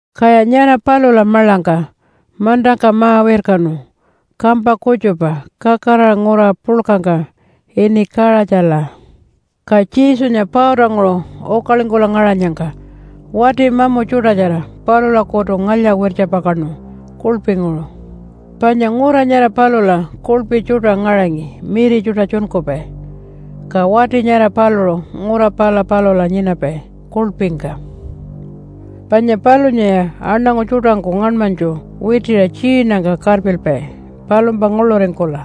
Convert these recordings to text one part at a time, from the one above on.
Kaya nyara palula maḻangka mantangka ma-wirkanu kampa kutjupa kakaraṟa ngura puḻkangka ini Kaṟatjala. Ka Jesunya pautanguṟu ukalingkula ngaṟanyangka wati mamu tjuṯatjara palulakutu ngalya-wirtjapakaṉu kuḻpinguṟu. Panya ngura nyara palula kuḻpi tjuṯa ngaṟangi miri tjuṯa tjunkupai. Ka wati nyara paluṟu ngura pala palula nyinapai kuḻpingka. Panya palunyaya aṉangu tjuṯangku ngaṉmanytju witiṟa tjiinangka karpilpai palumpa nguḻuringkula.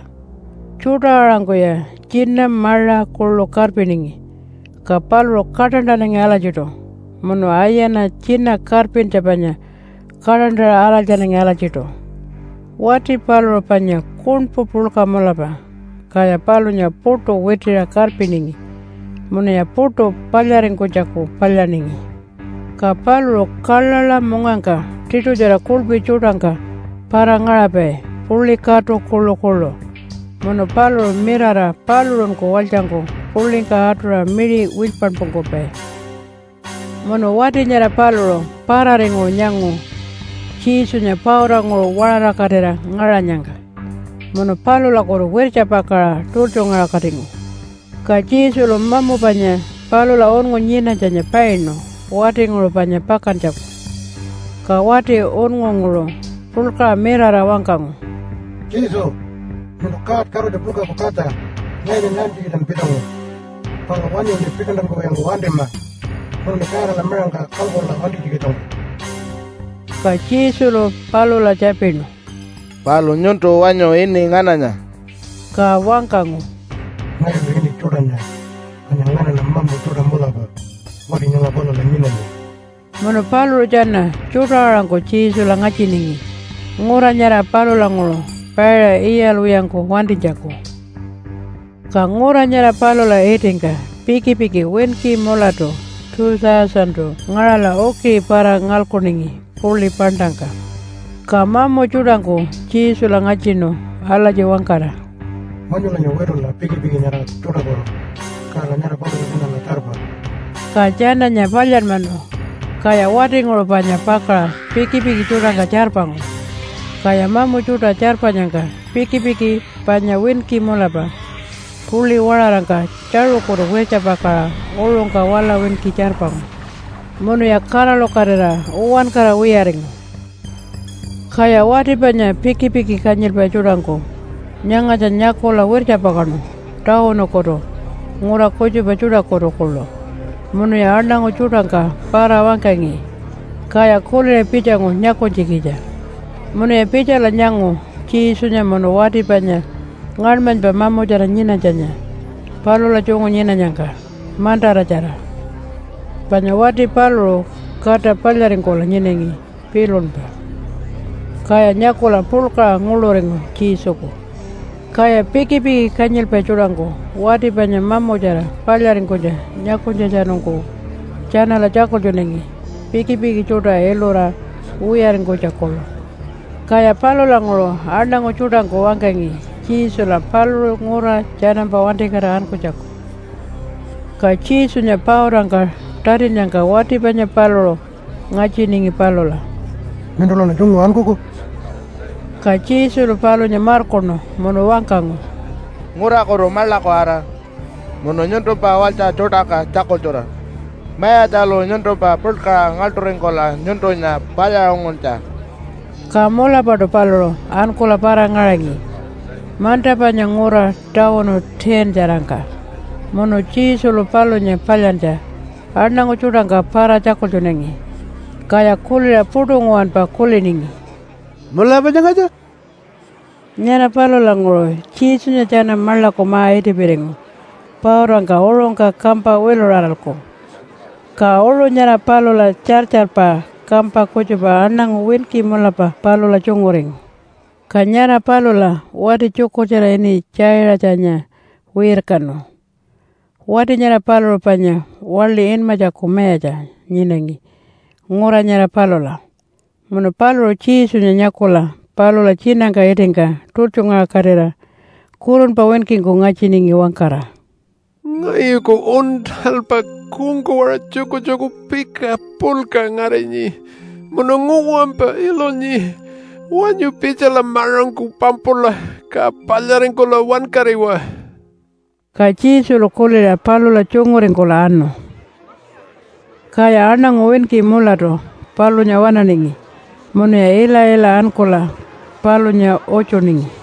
Tjuṯa-aṟangkuya tjina maṟa kuḻu karpiningi, ka paluṟu kaṯantanangi alatjiṯu munu ayana tjina karpintja panya kaṯantaṟa araltjanangi alatjiṯu. Wati paluṟu panya kuṉpu puḻka mulapa, kaya palunya puṯu witiṟa karpiningi munuya puṯu palyaringkunytjaku palyaningi. Ka paluṟu kaḻaḻa mungangka tiṯutjara kuḻpi tjuṯangka para-ngaṟapai puḻi katu kuḻukuḻu munu paluṟu mirara paluṟunku walytjangku puḻingka atuṟa miṟi wilypanpungkupai. Munu wati nyara paluṟu pararinguṟu nyangu Jesunya pautanguṟu waṟarakatira ngaṟanyangka munu palulakutu wirtjapakaṟa tultjungaṟakatingu. Ka Jesulu mamu panya palula unngu nyinanytjanya painu watinguṟu panya pakantjaku. Ka wati unngunguṟu puḻkaṟa mirara wangkangu, “Jesu, nyuntu God Katutja puḻkaku katja. Ngayunya nyaantjikitjan pitjangu? Palu wanyuṉi pikantankuwiyangku wantima munuṉi Godala miṟangka kalkula wantinytjikitjangku.” Ka Jesulu palula tjapinu, “Palu nyuntu wanyu ini ngananya?” Ka wangkangu, “Ngayulu ini Tjuṯanya panya nganaṉa mamu tjuṯa mulapa wati nyanga palula nyinanyi.” Munu paluṟu tjana tjuṯa-aṟangku Jesula ngatjiningi ngura nyara palulanguṟu paiṟa iyalwiyangku wantinytjaku. Ka ngura nyara palula itingka pikipiki winki mulatu 2,000-tu ngaṟala ukiṟi para-ngalkuningi puḻi paṉṯangka. Ka mamu tjuṯangku Jesula ngatjinu alatji wangkara, “Wanyulanya witula pikipiki nyara tjuṯakutu, kala nyara palula tjanala tjarpa.” Ka tjananya palyanmanu. Kaya watinguṟu panya pakaṟa pikipiki tjuṯangka tjarpangu, kaya mamu tjuṯa tjarpanyangka pikipiki panya winki mulapa puḻi waṟarangka tjaṟukutu wirtjapakaṟa uṟungka wala winki tjarpangu munuya kaṟalukatira uwankara wiyaringu. Kaya wati panya pikipiki kanyilpai tjuṯangku nyangatja nyakula wirtjapakaṉu tawunukutu ngura kutjupa tjuṯakutu kuḻu munuya aṉangu tjuṯangka para-wangkangi. Kaya kuliṟa pitjangu nyakunytjikitja. Munuya pitjala nyangu Jesunya munu wati panya ngaṉmanypa mamutjara nyinanytjanya palula tjungu nyinanyangka mantaratjara, panya wati paluṟu kata palyaringkula nyinangi pilunpa. Kaya nyakula puḻkaṟa nguḻuringu Jesuku. Kaya pikipiki kanyilpai tjuṯangku wati panya mamutjara palyaringkunytja nyakunytjatjanungku tjanala tjakultjunangi, pikipiki tjuṯa ilura wiyaringkunytja kuḻu. Kaya palulanguṟu aṉangu tjuṯangku wangkangi Jesula paluṟu ngura tjanampa wantikatira ankunytjaku. Ka Jesunya pautangka tatinnyangka wati panya paluṟu ngatjiningi palula, “Nyuntulaṉa tjungu ankuku?” Ka Jesulu palunya markuṉu munu wangkangu, “Ngurakutu maḻaku ara munu nyuntumpa walytja tjuṯangka tjakultjura Mayatjalu nyuntumpa puḻkaṟa ngaḻṯuringkula nyuntunya palyaṟunguntja.” Ka mulapaṯu paluṟu ankula para-ngaṟangi manta panya ngura tawunu 10-tjarangka munu Jesulu palunya palyantja aṉangu tjuṯangka para-tjakultjunangi, kaya kuliṟa puṯu nguwanpa kuliningi, “Mulapa nyangatja?” Nyara palulanguṟu Jesunya tjana maḻaku ma-itipiringu pautangka uṟungka kampa wiluṟaralku. Ka uṟu nyara palula tjartjarpa kampa kutjupa aṉangu winki mulapa palula tjunguringu. Ka nyara palula wati tjukurtjara ini Tjaiṟatjanya wirkanu. Wati nyara paluṟu panya waḻi inmatjaku mayatja nyinangi ngura nyara palula, munu paluṟu Jesunya nyakula palula tjinangka itingka tultjungaṟakatira kurunpa winkingku ngatjiningi wangkara, “Ngayuku uṉṯalpa kungkawaṟa tjukutjuku pika puḻka ngarinyi munu nguwanpa ilunyi. Wanyu pitjala maṟangku pampula ka palyaringkula wankariwa.” Ka Jesulu kuliṟa palula tjunguringkula anu. Kaya aṉangu winki mulatu palunya waṉaningi munuya ila-ila ankula palunya utjuningi.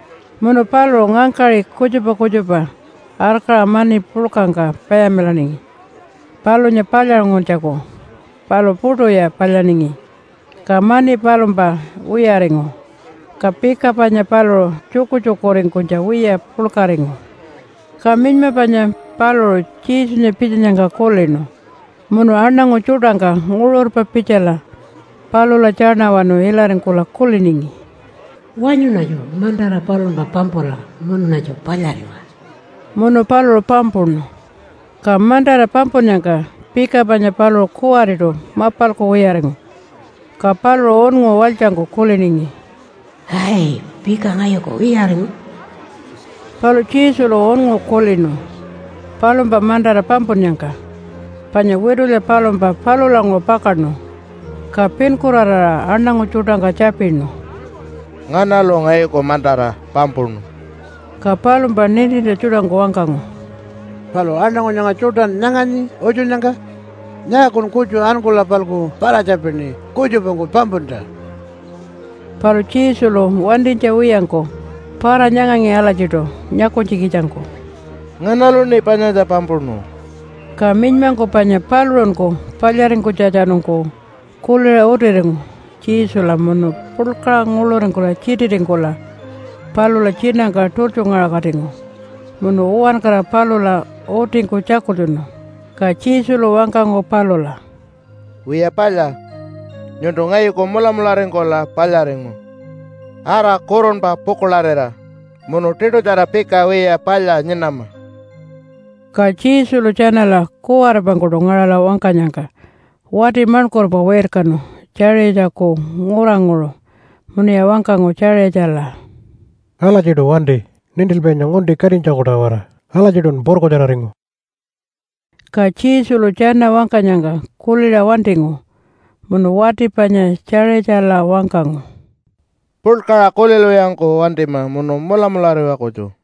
Munu paluṟu ngangkaṟi kutjupa kutjupa arkaṟa mani puḻkangka payamilaningi palunya palyaṟunguntjaku, palu puṯuya palyaningi, ka mani palumpa wiyaringu. Ka pika panya paluṟu tjukutjukuringkunytja wiya puḻkaringu. Ka minyma panya paluṟu Jesunya pitjanyangka kulinu munu aṉangu tjuṯangka nguṟurpa pitjala palula tjaṉawanu ilaringkula kuliningi, “Wanyuṉatju mantara palumpa pampula munuṉatju palyariwa.” Munu paluṟu pampuṉu. Ka mantara pampunnyangka pika panya paluṟu kuwariṯu mapalku wiyaringu. Ka paluṟu unngu walytjangku kuliningi, “Ai, pika ngayuku wiyaringu.” Palu Jesulu unngu kulinu palumpa mantara pampunnyangka, panya witulya palumpa palulanguṟu pakaṉu. Ka pinkuraraṟa aṉangu tjuṯangka tjapinu, “Nganalu ngayuku mantara pampuṉu?” Ka palumpa nintintja tjuṯangku wangkangu, “Palu aṉangu nyanga tjuṯan nyanganyi utjunnyangka? Nyaakun kutju ankula-palku para-tjapini kutjupangku pampuntja?” Palu Jesulu wantinytja wiyangku para-nyangangi alatjiṯu nyakunytjikitjangku, “Nganaluṉi panyatja pampuṉu?” Ka minymangku panya paluṟunku palyaringkunytjatjanungku kuliṟa utiringu Jesula munu puḻkaṟa nguḻuringkula tjititingkula palula tjinangka tultjungaṟakatingu munu uwankara palula utingku tjakultjunu. Ka Jesulu wangkangu palula, “Wiya palya, nyuntu ngayuku mulamularingkula palyaringu. Ara kurunpa pukuḻarira, munu tiṯutjara pika wiya palya nyinama.” Ka Jesulu tjanala kuwaripangkuṯu ngaṟala wangkanyangka wati maṉkurpa wirkanu Tjaiṟatjaku nguranguṟu munuya wangkangu Tjaiṟatjala, “Alatjiṯu wanti nintilpainya ngunti katinytjaku-tawara. Alatjiṯun purkutjararingu.” Ka Jesulu tjana wangkanyangka kuliṟa wantingu munu wati panya Tjaiṟatjala wangkangu, “Puḻkaṟa kulilwiyangku wantima munu mulamulariwa kutju.”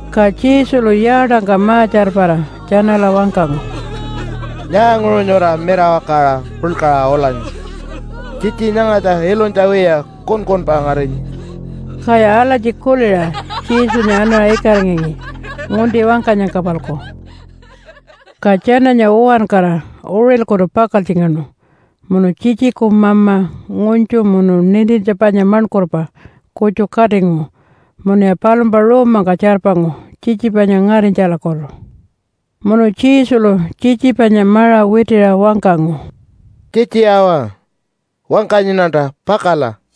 Ka Jesulu yaatangka ma-tjarpara tjanala wangkangu, “Nyaanguṟu nyura mirawakaṟa puḻkaṟa ulanyi? Tjitji nyangatja ilunytja wiya, kunkunpa ngarinyi.” Kaya alatji kuliṟa Jesunya anaṟa ikaringangi ngunti wangkanyangka-palku. Ka tjananya uwankara uṟilkutu pakaltjingaṉu munu tjitjiku mama ngunytju munu nintintja panya maṉkurpa kutju katingu munuya palumpa ruumangka tjarpangu tjitji panya ngarinytjalakutu. Munu Jesulu tjitji panya maṟa witiṟa wangkangu, “Tjitji awa, wangkanyiṉanta, pakala.”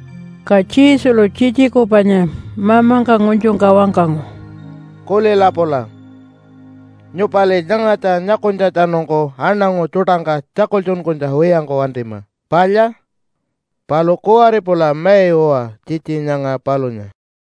Ka Jesulu tjitjiku panya mamangka ngunytjungka wangkangu, “Kulila pula! Nyupali nyangatja nyakunytjatjanungku aṉangu tjuṯangka tjakultjunkunytja wiyangku wantima. Palya? Palu kuwari pula mai uwa tjitji nyanga palunya.”